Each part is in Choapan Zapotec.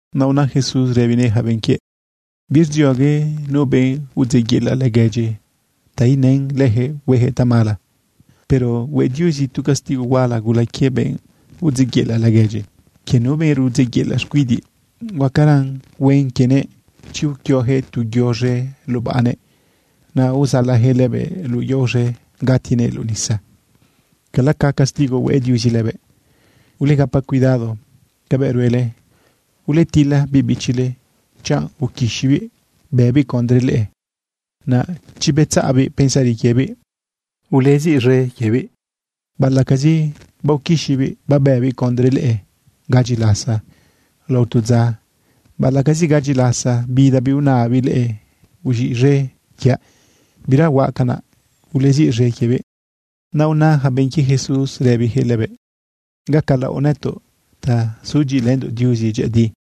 Naꞌ una Jesús rëbinëꞌ yaca benꞌ quiëꞌ: ―Birdziogue nu benꞌ udzeꞌyela laguedyi ta inën leyaquëꞌ hueyaquëꞌ tamala. Pero hue Diuzi tu castigo huala gula quie benꞌ udzeꞌyela laguedyi. Quie nu benꞌ rudzeꞌyela xcuidiꞌ, huacaran huen quienëꞌ chi uquioyaquëꞌ tu yo z̃e lubaꞌnëꞌ, naꞌ uzalayaquëꞌ lëbëꞌ luꞌu yao z̃e gatinëꞌ luꞌu nisa, cala ca castigo hue Diuzi lëbëꞌ. Ulegapa cuidado cabëꞌ ruele. ’Uletila biꞌ bichile chanꞌ uquixibiꞌ bëbiꞌ condre leꞌe. Naꞌ chi betzaꞌbiꞌ pensari quiebiꞌ, uleziꞌz̃e quiebiꞌ. ’Baꞌalaꞌcazi baoquixibiꞌ babëbiꞌ condre leꞌe gadyi lasa lao tu dza, baꞌalaꞌcazi gadyi lasa bidabiꞌ unabiꞌ leꞌe: “Uz̃iꞌz̃e quiaꞌ, bira huaꞌ canaꞌ”, uleziꞌz̃e quiebiꞌ. Naꞌ una yaca benꞌ quie Jesús rëbiyaquëꞌ lëbëꞌ: ―Gacalaoꞌ nëtoꞌ ta sudyiꞌilëndoꞌ Diuzi dyëꞌëdi.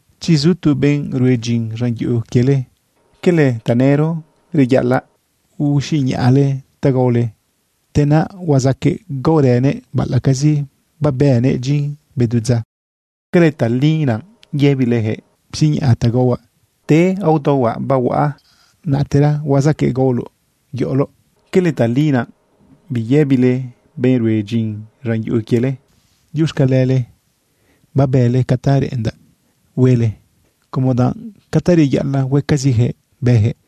―Chi zu tu benꞌ rue dyin z̃an yuꞌu quiele ¿cala tanëro reyaꞌalaꞌ usiñaꞌnëꞌ ta gaole, te naꞌ huazaqueꞌ gaorënëꞌ, baꞌalaꞌcazi babënëꞌ dyin bedu dza? ¿Cala tali naꞌ yëbileyaquëꞌ: “Psiñaꞌ ta gaohuaꞌ, te aodaohuaꞌ bahuaꞌa, natera huazaqueꞌ gaoloꞌ yoꞌoloꞌ”? ¿Cala tali naꞌ biyëbile benꞌ rue dyin z̃an yuꞌu quiele: “Diuxcalele babële ca ta reꞌendaꞌ huele”, como danꞌ ca ta reyaꞌalaꞌ huecaziyaquëꞌ bëyaquëꞌ?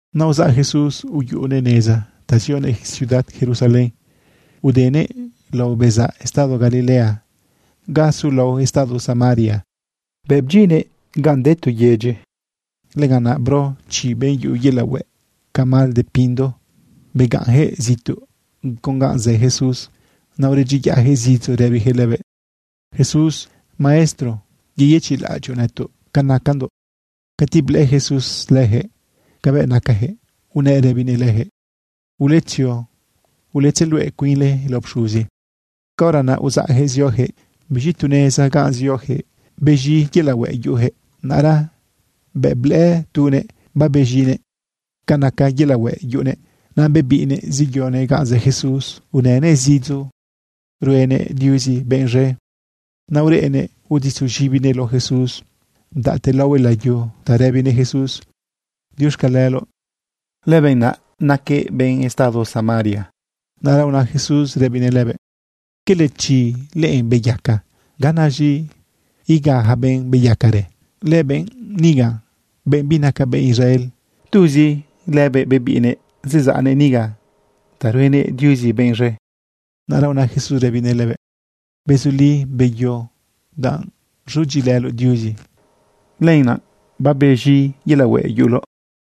Naꞌ uzaꞌ Jesús uyuꞌunëꞌ neza ta zionëꞌ ciudad Jerusalén udenëꞌ lao bezaꞌ estado Galilea ga sulao estado Samaria. Bëꞌ bdyinnëꞌ ganꞌ de tu yedyi, lëganꞌ naꞌ bro chi benꞌ yuꞌu yelaꞌ hueꞌ ca mal de pindo. Begaꞌnyaquëꞌ zituꞌ con ganꞌ zë Jesús. Naꞌ uredyiyaꞌyaquëꞌ zidzo rëbiyaquëꞌ lëbëꞌ: ―¡Jesús, Maestro, yeyëchiꞌlaꞌadyoꞌ nëtoꞌ ca nacandoꞌ! Cati blëꞌë Jesús leyaquëꞌ cabëꞌ nacayaquëꞌ, unëꞌ rëbinëꞌ leyaquëꞌ: ―Uletzio uletzeluꞌe cuinle lao pxuzi. Caora naꞌ uzaꞌyaquëꞌ zioyaquëꞌ. Biz̃i tu neza ganꞌ zioyaquëꞌ bez̃i yelaꞌ hueꞌ yuꞌuyaquëꞌ. Naꞌra bëꞌ blëꞌë tunëꞌ babez̃inëꞌ ca naca yelaꞌ hueꞌ yuꞌunëꞌ, naꞌ bebiꞌnëꞌ zeyonëꞌ ganꞌ zë Jesús unënëꞌ zidzo ruenëꞌ Diuzi benꞌ z̃e. Naꞌ ureꞌnëꞌ uditzu z̃ibinëꞌ lao Jesús, bdaꞌte laohue layu ta rëbinëꞌ Jesús: “Diuxcaleloꞌ.” Lëbenꞌ naꞌ naquëꞌ benꞌ estado Samaria. Naꞌra una Jesús rëbinëꞌ lëbëꞌ: ―¿Cala chi leꞌe beyaca? ¿Ganaz̃i iga yaca benꞌ beyacarë? Lëbenꞌ niga, benꞌ binaca benꞌ Israel, ¿tuzi lëbëꞌ bebiꞌnëꞌ zezaꞌnëꞌ niga ta ruenëꞌ Diuzi benꞌ z̃e? Naꞌra una Jesús rëbinëꞌ lëbëꞌ: ―Bezuli, beyo. Danꞌ rzudyiꞌilëloꞌ Diuzi, lenaꞌ babez̃i yelaꞌ hueꞌ yuꞌuloꞌ.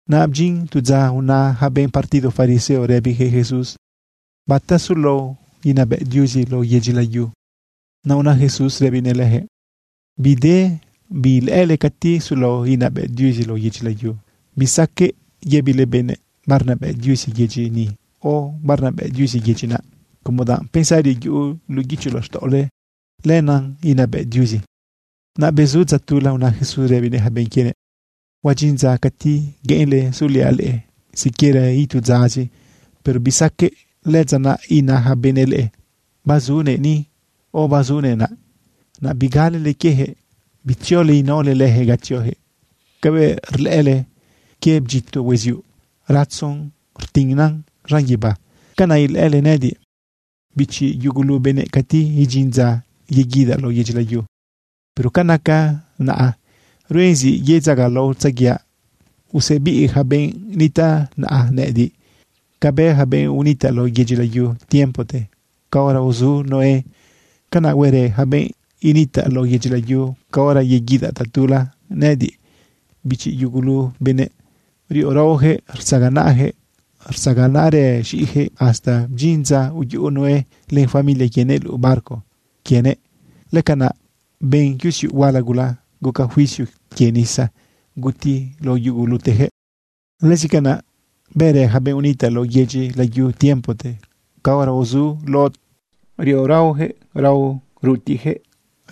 Naꞌ bdyin tu dza una yaca benꞌ partido fariseo rëbiyaquëꞌ Jesús: ―¿Bata sulao inabëꞌ Diuzi lao yedyi layu? Naꞌ una Jesús rëbinëꞌ leyaquëꞌ: ―Bide bi ilëꞌële cati sulao inabëꞌ Diuzi lao yedyi layu. Bisaqueꞌ yëbile benëꞌ: “Barnabëꞌ Diuzi yedyi niꞌ o “Barnabëꞌ Diuzi yedyi naꞌ” como danꞌ pensari yuꞌu luꞌu guicho laxtaꞌole, lenaꞌ inabëꞌ Diuzi. Naꞌ bezu dza tula una Jesús rëbinëꞌ yaca benꞌ quienëꞌ: ―Huadyin dza cati gueꞌenle suliaꞌ leꞌe siquiera itu dzazi, pero bisaqueꞌ. Lëdza naꞌ ina yaca benëꞌ leꞌe: “Bazunëꞌ ni” o “Bazunëꞌ naꞌ” naꞌ bigalele quieyaquëꞌ. Bitziole inaole leyaquëꞌ ga tzioyaquëꞌ. Cabëꞌ rlëꞌële quie bdyito hueziuꞌ ratzo rtinan z̃an guibá, canaꞌ ilëꞌële nëꞌëdiꞌ, bichi yugulu benëꞌ, cati idyin dza yeguidaꞌ lao yedyi layu. Pero ca naca naꞌa, ruen zi yedzagalaotzaguiaꞌ usebiꞌ yaca benꞌ nitaꞌ naꞌa nëꞌëdiꞌ. Cabëꞌ bë yaca benꞌ unitaꞌ lao yedyi layu tiempote caora uzu Noé, canaꞌ huerë yaca benꞌ initaꞌ lao yedyi layu caora yeguidaꞌ tatula nëꞌëdiꞌ, bichi yugulu benëꞌ. Riꞌo raoyaquëꞌ, rtzaganaꞌyaquëꞌ, rtzaganaꞌrë z̃iꞌiyaquëꞌ hasta bdyin dza uyuꞌu Noé len familia quienëꞌ luꞌu barco quienëꞌ. Lëcanaꞌ ben yusiuꞌ huala gula, guca juicio quie nisa, guti lao yuguluteyaquëꞌ. Lëzi canaꞌ bërë yaca benꞌ unitaꞌ lao yedyi layu tiempote caora uzu Lot. Riꞌo raoyaquëꞌ, raꞌo rutiꞌyaquëꞌ,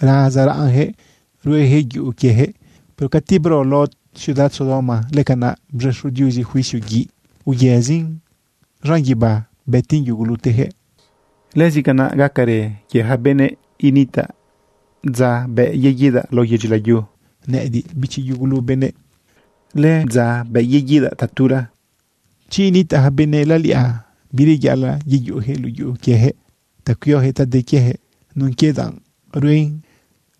razaraꞌnyaquëꞌ rueyaquëꞌ yuꞌu quieyaquëꞌ. Pero cati bro Lot ciudad Sodoma, lëcanaꞌ bz̃exo Diuzi juicio guiꞌ, uyëzin z̃an guibá, bëtin yuguluteyaquëꞌ. Lëzi canaꞌ gacarë quie yaca benëꞌ initaꞌ dza bëꞌ yeguidaꞌ lao yedyi layu nëꞌëdiꞌ, bichi yugulu benëꞌ. ’Lëdza bëꞌ yeguidaꞌ tatula, chi initaꞌ yaca benëꞌ laliꞌa, bireyaꞌalaꞌ yeyuꞌuyaquëꞌ luꞌu yuꞌu quieyaquëꞌ ta cuioyaquëꞌ ta de quieyaquëꞌ nun quie danꞌ ruen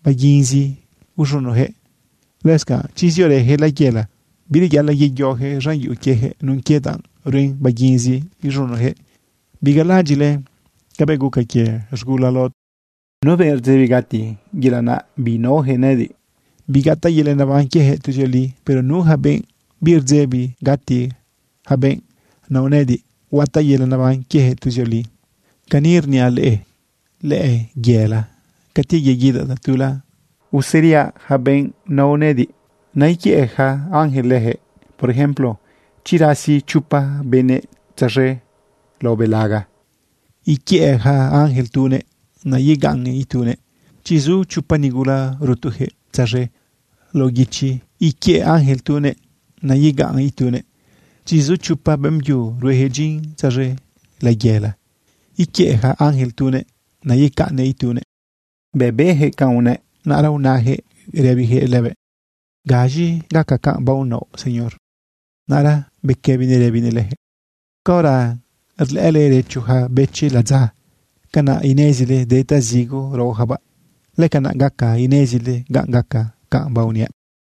baguinzi iz̃unoyaquëꞌ. Lëscanꞌ chi ziorëyaquëꞌ layela, bireyaꞌalaꞌ yeyoyaquëꞌ z̃an yuꞌu quieyaquëꞌ nun quie danꞌ ruen baguinzi iz̃unoyaquëꞌ. Bigalalaꞌadyiꞌle cabëꞌ guca quie z̃gula Lot. Nu benꞌ rdzebi gati, yelaꞌ naꞌ binaoyaquëꞌ nëꞌëdiꞌ, bigataꞌ yelaꞌ neban quieyaquëꞌ tuzioli. Pero nu yaca benꞌ birdzebi gati, yaca benꞌ nao nëꞌëdiꞌ, huataꞌ yelaꞌ neban quieyaquëꞌ tuzioli. ’Cani rniaꞌ leꞌe, lëyela cati yeguidaꞌ tatula, useriaꞌ yaca benꞌ nao nëꞌëdiꞌ, naꞌ iquiëꞌ yaca ángel leyaquëꞌ. Por ejemplo, chi rasi chopa benëꞌ tzaz̃e lao belaga, iquiëꞌ yaca ángel tunëꞌ, naꞌ yegaꞌn itunëꞌ. Chi zu chopa nigula rutuyaquëꞌ tzaz̃e lao guichi, iquiëꞌ yaca ángel tunëꞌ, naꞌ yegaꞌn itunëꞌ. Chi zu chopa beꞌmbyu rueyaquëꞌ dyin tzaz̃e layela, iquiëꞌ yaca ángel tunëꞌ, naꞌ yegaꞌn itunëꞌ. Bëꞌ beyaquëꞌ canꞌ unëꞌ, naꞌra unayaquëꞌ rëbiyaquëꞌ lëbëꞌ: ―¿Gaz̃i gaca canꞌ baonaoꞌ, Señor? Naꞌra bequëbinëꞌ rëbinëꞌ leyaquëꞌ: ―Caora rlëꞌële rëcho yaca bëchi ladza, canaꞌ inezile de ta zigo raoyacabaꞌ. Lëcanaꞌ gaca inezile ganꞌ gaca canꞌ baoniaꞌ.